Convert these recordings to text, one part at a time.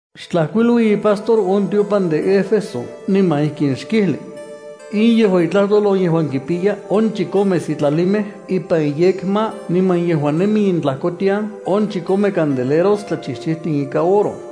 ’Xtlajkuilui ipastor on tiopan de Éfeso niman ijkin xkijli: “In yejua itlajtol on yejuan kipiya on chikome sitlalimej ipan iyekma, niman yejuan nemi intlajkotian on chikome candeleros tlachijchijtin ikan oro.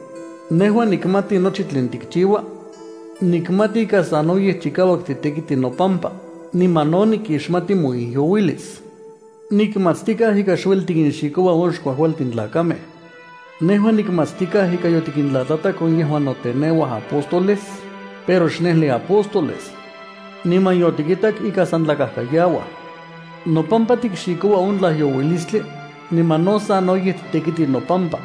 Nejua nikmati nochi tlen tikchiua. Nikmati ika sanoyej chikauak titekiti nopampa, niman no nikixmati moijyouilis. Nikmatstikaj ika xueli tikinxikoua on xkuajkualtin tlakamej. Nejua nikmatstikaj ika yotikintlatlatak on yejuan noteneuaj apóstoles, pero xnejli apóstoles. Niman yotikitak ika san tlakajkayauaj. Nopampa tikxikoua on tlajyouilistli, niman no sanoyej titekiti nopampa.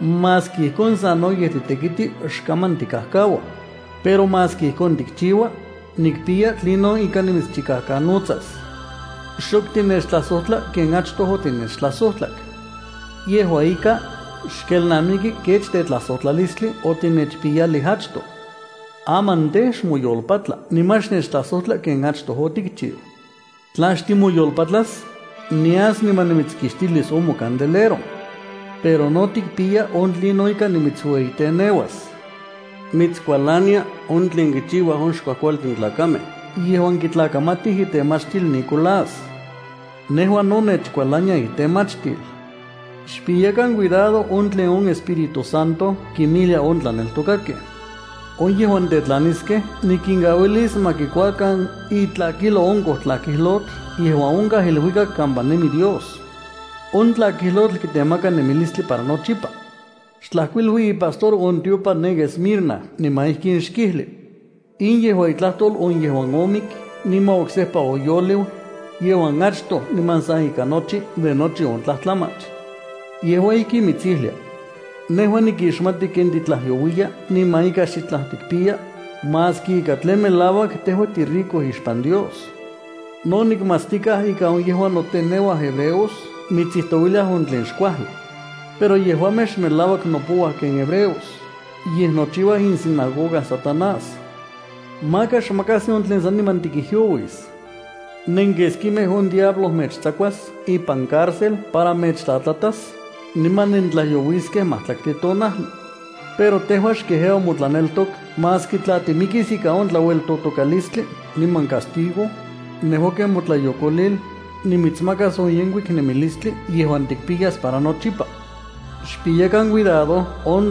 Maski ijkon sanoyej titekiti, xkaman tikajkaua. Pero maski ijkon tikchiua, nikpiya tlinon ika nimitschikajkanotsas. Xok tinechtlajsojtla ken achtoj otinechtlajsojtlak. Yejua ika, xkelnamiki kech tetlajsojtlalistli otinechpiyalij achtoj. Aman tej, xmoyolpatla niman xnechtlajsojtla ken achtoj otikchiu. Tla xtimoyolpatlas, nias niman nimitskixtilis on mocandelero. Pero no tikpiya on tlinon ika nimitsueyiteneuas. Mitskualania on tlen kichiuaj on xkuajkualtin tlakamej yejuan kitlakamatij itemachtil Nicolás. Nejua no nechkualania itemachtil. Xpiyakan cuidado on tlen on Espíritu Santo kinmijlia on tlaneltokakej. On yejuan tetlantiskej nikinkauilis ma kikuakan itlakijlo on kojtlakijlotl yejuan onkaj iluikak kampa nemi Dios. On tlakijlotl kitemaka nemilistli para nochipa.” ’Xtlajkuilui ipastor on tiopan ne Esmirna niman ijkin xkijli: “In yejua itlajtol on yejuan omik niman oksejpa oyoliu, yejuan achtoj niman sa ika nochi de nochi on tlajtlamach. Yejua ijkin mitsijlia: Nejua nikixmati ken titlajyouiya niman ika xitlaj tikpiya, maski ika tlen melauak tejua tirico ixpan Dios. No nikmatstikaj ika on yejuan noteneuaj hebreos mitsijtouiliaj on tlen xkuajli. Pero yejuamej xmelauak nopouaj ken hebreos, yej nochiuaj isinagoga Satanás. Maka xmakajsi on tlen saniman tikijyouis. Nenkeskimej on diablo mechtsakuas ipan cárcel para mechtlatlatas, niman nentlajyouiskej majtlaktli tonajli. Pero tejua xkejeua motlaneltok maski tla timikis ika on tlaueltotokalistli niman castigo, niman nejua nimitsmakas ken motlayokolil on yejkuik nemilistli yejuan tikpiyas para nochipa. Xpiyakan cuidado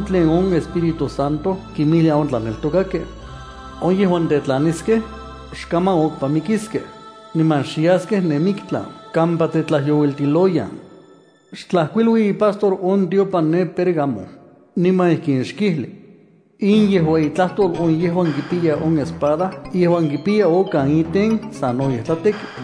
tlen on Espíritu Santo kinmijlia on tlaneltokakej. On yejuan tetlaniskej, xkaman okpa mikiskej, niman xyaskej ne miktlan kampa tetlajyouiltiloyan.” ’Xtlajkuilui ipastor on tiopan ne Pérgamo, niman ijkin xkijli: “In yejua itlajtol on yejuan kipiya on espada In yejuan kipiya okan iten sanoyej tlateki.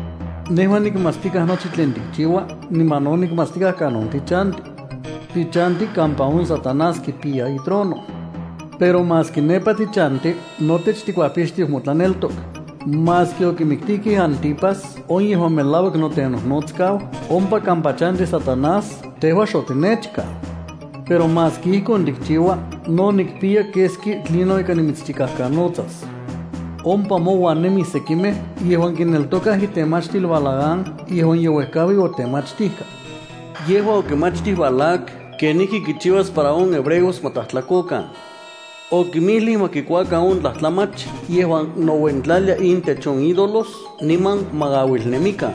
Nejua nikmatstikaj nochi tlen tikchiua niman no nikmatstikaj kanon tichanti. Tichanti kampa on Satanás kipiya itrono. Pero maski nepa tichanti, notech tikuajpixtiu motlaneltok. Maski okimiktijkej Antipas, on yejuan melauak notenojnotsakau, ompa kampa chanti Satanás, tejua xotinechkau. Pero maski ijkon tikchiua no nikpiya keski tlinon ika nimitschikajkanotsas. Ompa mouan nemij sekimej yejuan ipan nouikaj itemachtil Balaam yejuan ye uejkaui otemachtijka. Yejua okimachtij Balac kenijki kichiuas para on hebreos ma tlajtlakokan. Okimijlij ma kikuakan on tlajtlamach yejuan nouentlalia intech on ídolos niman ma auilnemikan.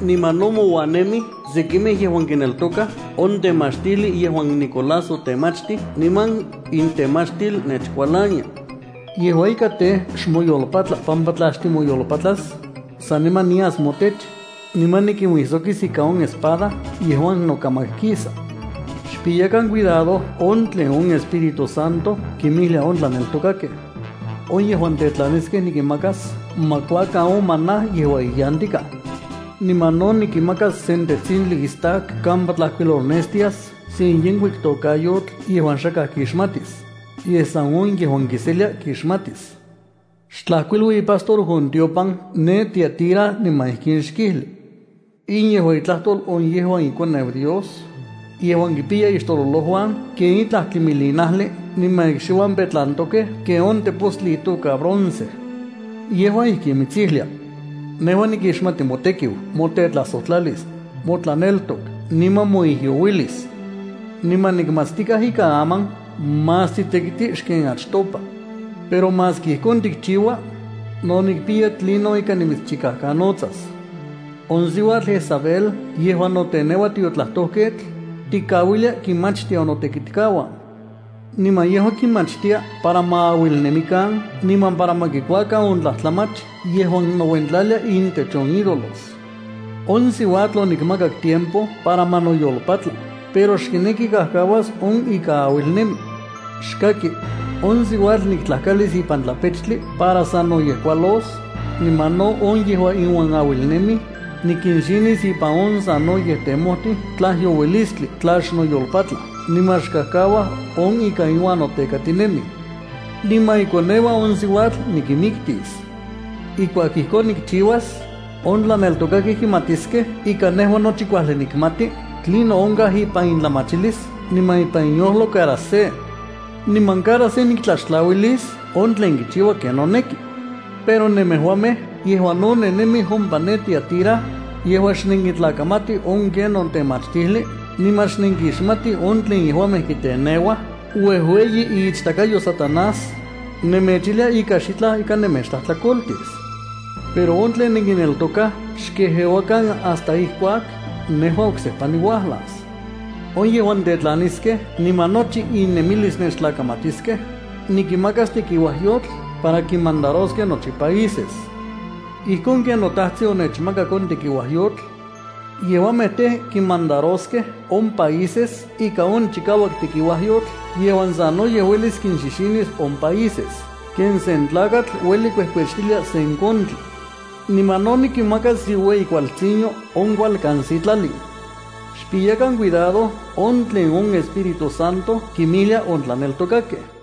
Niman no mouan nemij sekimej yejuan ipan nouikaj on temachtijli yejuan Nicolás otemachtij niman intemachtil nechkualania. Yejua ika tej, xmoyolpatla pampa tla xtimoyolpatlas, saniman nias motech, niman nikinuijsokis ika on espada yejuan nokamak kisa. Xpiyakan cuidado on tlen on Espíritu Santo kinmijlia on tlaneltokakej. On yejuan tetlaniskej nikinmakas ma kuakan on maná yejuan iyantikaj. Niman no nikinmakas sen tetsintli istak kampa tlajkuilolnestias sen yenkuik tokayotl yejuan xakaj kixmatis, yej san on yejuan kiselia kixmatis.” ’Xtlajkuilui ipastor on tiopan ne Tiatira niman ijkin xkijli: “In yejua itlajtol on yejuan iKoneu Dios, yejuan kipiya ixtololojuan ken itlaj tlimilinajli niman ikxiuan petlantokej ken on tepostli itoka bronce. Yejua ijkin mitsijlia: Nejua nikixmati motekiu, motetlajsojtlalis, motlaneltok, niman moijyouilis. Niman nikmatstikaj ika aman más titekiti xken achtopa. Pero maski ijkon tikchiua, no nikpiya tlinon ika nimitschikajkanotsas. On siuatl Jezabel yejuan noteneua tiotlajtojketl, tikauilia kinmachtia on notekitkauan. Niman yejua kinmachtia para ma auilnemikan niman para ma kikuakan on tlajtlamach yejuan nouentlalia intech on ídolos. On siuatl onikmakak tiempo para ma noyolpatla, pero xkineki kajkauas on ika auilnemi. Xkaki, on siuatl niktlajkalis ipan tlapechtli para sanoyej kualos, niman no on yejuan iuan auilnemij, nikinxinis ipan on sanoyej temojtij tlajyouilistli tla xnoyolpatlaj niman xkajkauaj on ika iuan notekatinemij. Niman ikoneuan on siuatl nikinmiktis. Ijkuak ijkon nikchiuas, on tlaneltokakej kimatiskej ika nejua nochi kuajli nikmati tlinon onkaj ipan itlamachilis niman ipan iyojlo cada se, niman cada se niktlaxtlauilis on tlen kichiua ken noneki. Pero nemejuamej yejuan no nennemij ompa ne Tiatira, yejuan xnenkitlakamatij on kenon temachtijli niman xnenkixmatij on tlen yejuamej kiteneuaj uejueyi iichtakayo Satanás, nemechijlia ika xitlaj ika nemechtlajtlakoltis. Pero on tlen nenkineltokaj xkejeuakan hasta ijkuak nejua oksejpa niuajlas. On yejuan tetlaniskej niman nochi innemilis nechtlakamatiskej, nikinmakas tekiuajyotl para kinmandaroskej nochi países, ijkon ken noTajtsin onechmakak on tekiuajyotl. Yejuamej tej, kinmandaroskej on países ika on chikauak tekiuajyotl yejuan sanoyej uelis kinxixinis on países ken sen tlakatl ueli kuejkuechtilia sen kontli. Niman no nikinmakas iueyi kualtsinyo on kualkan sitlalin. Xpiyakan cuidado on tlen on Espíritu Santo kinmijlia on tlaneltokakej.”